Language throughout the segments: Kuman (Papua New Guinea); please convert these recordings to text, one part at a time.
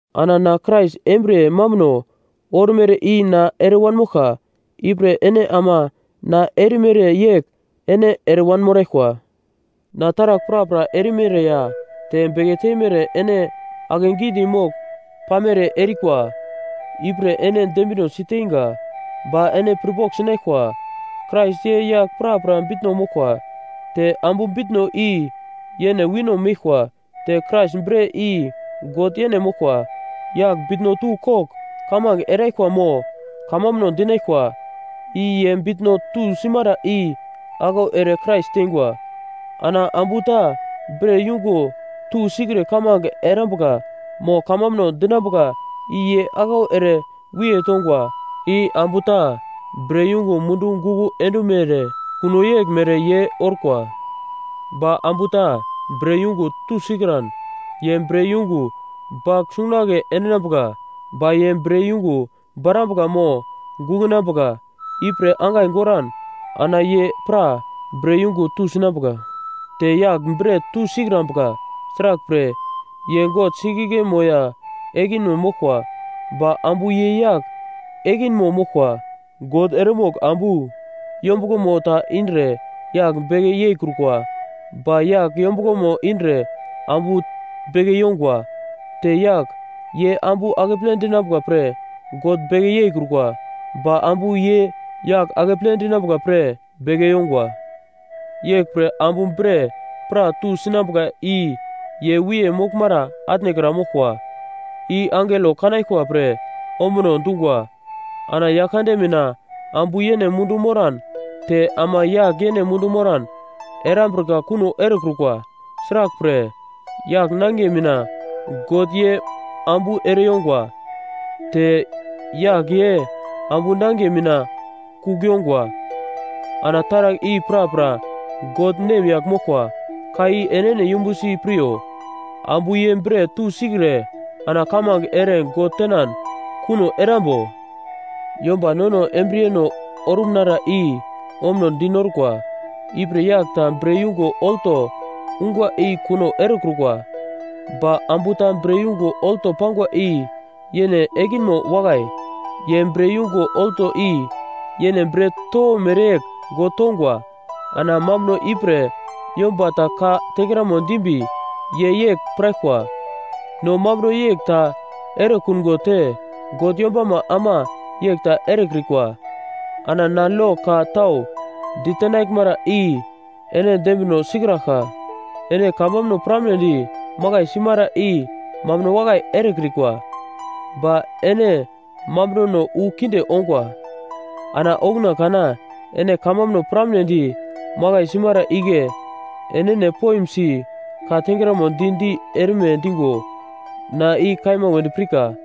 Ana na Krais embriye mambuno ormere i na ere wanmoglka, ipre ene ama na erimere yegl ene ere wanmoraglkwa. Na taragl prapra erimere ya te beke teimere ene akegidi mogl pamere erikwa, ipre ene dembina si teinga. Ba ene pirpogl sinaglkwa, Krais ye yagl prapra bitno moglkwa. Te ambu bitno i yene wino meglkwa, te Krais bre i God yene moglkwa. Yagl bitno tu kogl kamange eraglkwa mo kamambuno dinaglkwa, i ye bitno tusimara i aglau ere Krais teingwa. Ana ambu ta bre yungo tusikre kamange erambuka mo kamambuno dinambuka i ye aglau ere wiye tongwa. I ambu ta bre yungo mundu guko endumere kuno yegl mere ye orkwa. Ba ambu ta bre yungo tusikran, ye bre yungo bagl sungunagle endinambuka. Ba ye bre yungo borambuka mo gukunambuka ipre angai goran ana ye pra bre yungo tusinambuka. Te yagl bre tusikrambuka. Sraglpre, ye God singiglmo ya ekinmo moglkwa, ba ambu ye yagl ekinmo moglkwa. God eremogl ambu yombuglomo ta indre yagl beke yeikrukwa, ba yagl yombuglomo indre ambu beke yongwa. Te yagl, ye ambu akeple dinambuka pre God beke yeikrukwa, ba ambu, ye yagl akeple dinambuka pre beke yongwa. Yeglpre ambu bre pra tusinambuka i ye wiye moglmara atnekra moglkwa, i angelo kanaglkwa pre ombuno dungwa. Ana Yaglkande mina, ambu yene mundu moran te ama yagl yene mundu moran erambrika kuno erekrukwa. Sraglpre, yagl nangiye mina God ye ambu ere yongwa, te yagl ye ambu nangiye mina kugl yongwa. Ana taragl i prapra God nemyagl moglkwa. Ka i enene yumbusi piryo: Ambu ye bre tusikre ana kamange ere God tenan kuno erambo? Yomba nono embriyeno orumnara i ombuno dinorkwa. Ipre yagl ta bre yungo olto ungwa i kuno erekrukwa, ba ambu ta bre yungo olto pangwa i yene ekinmo wakai. Ye bre yungo olto i yene bre towo mereyegl God tongwa. Ana mambuno ipre yomba ta ka tengramo dimbi ye yegl piraglkwa: No mambuno yegl ta erekungo te God yombama ama yegl ta erekrikwa. Ana na lo ka tau ditenaglmara i ene dembino sikraglka. Ene kamambuno piramnedi makai simara i mambuno wakai erekrikwa, ba ene mambunono wu kinde ongwa. Ana okuna kana ene kamambuno piramnedi makai simara igle enene poimsi ka tengramo di-di erme digo na i kaima wedi pirka.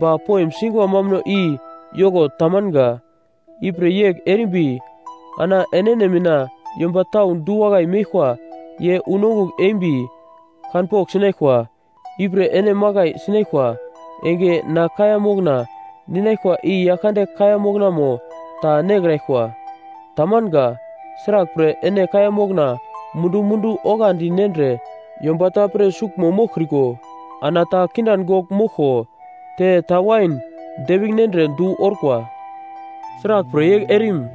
Ba poim singwa mambuno i yoko tamanga. Ipre yegl erimbi ana enene mina yomba tau du-wakai meglkwa ye unongugl embi kanpogl sinaglkwa. Ipre ene makai sinaglkwa enge ana kaiya mokna ninaglkwa i Yaglkande kaiya moknamo ta nekraglkwa. Tamanga. Sraglpre, ene kaiya mokna mundu-mundu oglandi nendre yomba ta pre suglmo moglkriko, ana ta kindan gogl moglko te ta wain depigl nendre du orkwa. Sraglpre yegl erim?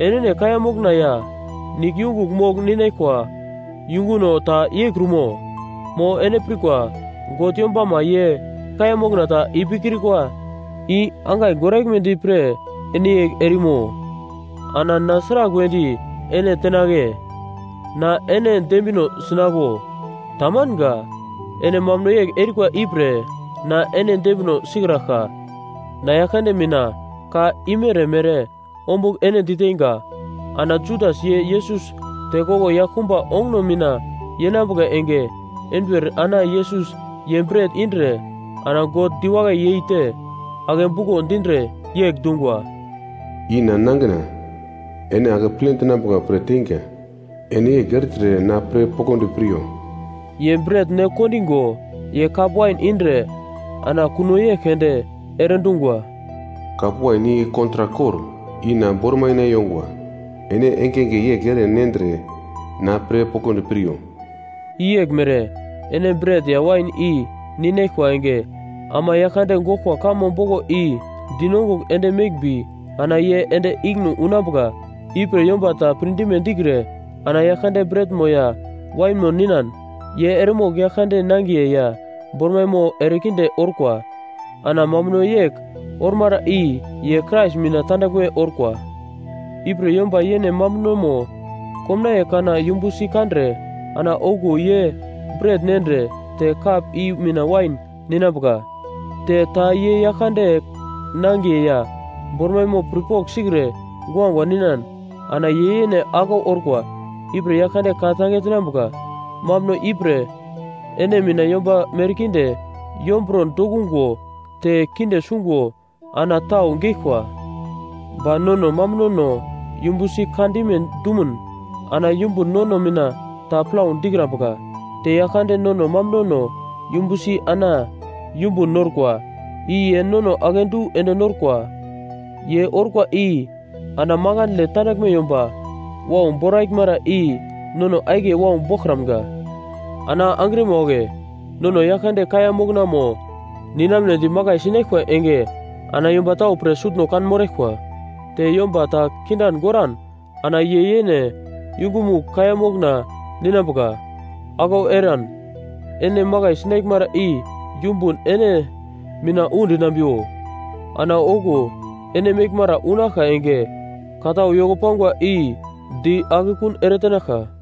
Enene kaiya mokna ya nigl yungugl mogl ninaglkwa yunguno ta yeikrumo? Mo ene pirkwa God yombama ye kaiya mokna ta ipikrikwa i angai goraglmedi pre ene yegl erimo? Ana na sragl wedi ene tenagle? Na ene dembino sinaglo? Tamanga. Ene mambuno yegl erikwa ipre na ene dembino sikraglka. Na Yaglkande mina ka imere-mere ombugl ene diteinga: Ana Judas ye Yesus tekoglo yaglkumba onguno mina yenambuka enge enduwer ana Yesus ye bret indre, ana God diwakai yeite, ake buko dindre, yegl dungwa, “I na nangina, ene akeple dinambuka pre teinga. Ene yegl ertre na pre poglodi piryo.” Ye bret ne kondigo, ye kap wain indre ana kuno yegl keunde ere dungwa, “Kap wain i kontrak kor, i na bormaima yongwa. Ene engenge yegl ere nendre na pre poglodi piryo.” I yeglmere, ene bret ya wain i ninaglkwa enge, ama Yaglkande goglkwa kamo boglo i dinongugl ende meglmbi ana ye ende ikine unambuka. Ipre yomba ta pirdime dikre ana Yaglkande bretmo ya wainmo ninan, ye eremogl Yaglkande nangiye ya bormaimo erekinde orkwa. Ana mambuno yegl ormara i ye Krais mina tandaglme orkwa. Ipre yomba yene mambunomo komnaiye kana yumbusi kandre ana okuwo ye bret nendre te kap i mina wain ninambuka. Te ta ye Yaglkande nangiye ya bormaimo pirpogl sikre guagua ninan ana ye yene aglau orkwa, ipre Yaglkande ka-tange tenambuka. Mambuno ipre ene mina yomba merkinde yomburo dokungo te kinde sungo ana tau geglkwa. Ba nono mambunono yumbusi kandime dumun ana yumbun nono mina ta plau dikrambuka. Te Yaglkande nono mambunono yumbusi ana yumbun norkwa, i ye nono akedu ende norkwa. Ye orkwa i ana makandle tandaglme yomba wau boraglmara i nono akiye wau boglkramga. Ana angrima wagle nono Yaglkande kaiya moknamo ninamnedi makai sinaglkwa enge ana yomba tau pre sutno kanmoraglkwa. Te yomba ta kindan goran ana ye yene yungumugl kaiya mokna ninambuka, aglau eran ene makai sinaglmara i yumbun ene mina udinambiwo. Ana okuwo ene meglmara unaglka enge ka tau yoko pangwa i di akekun eretenaglka.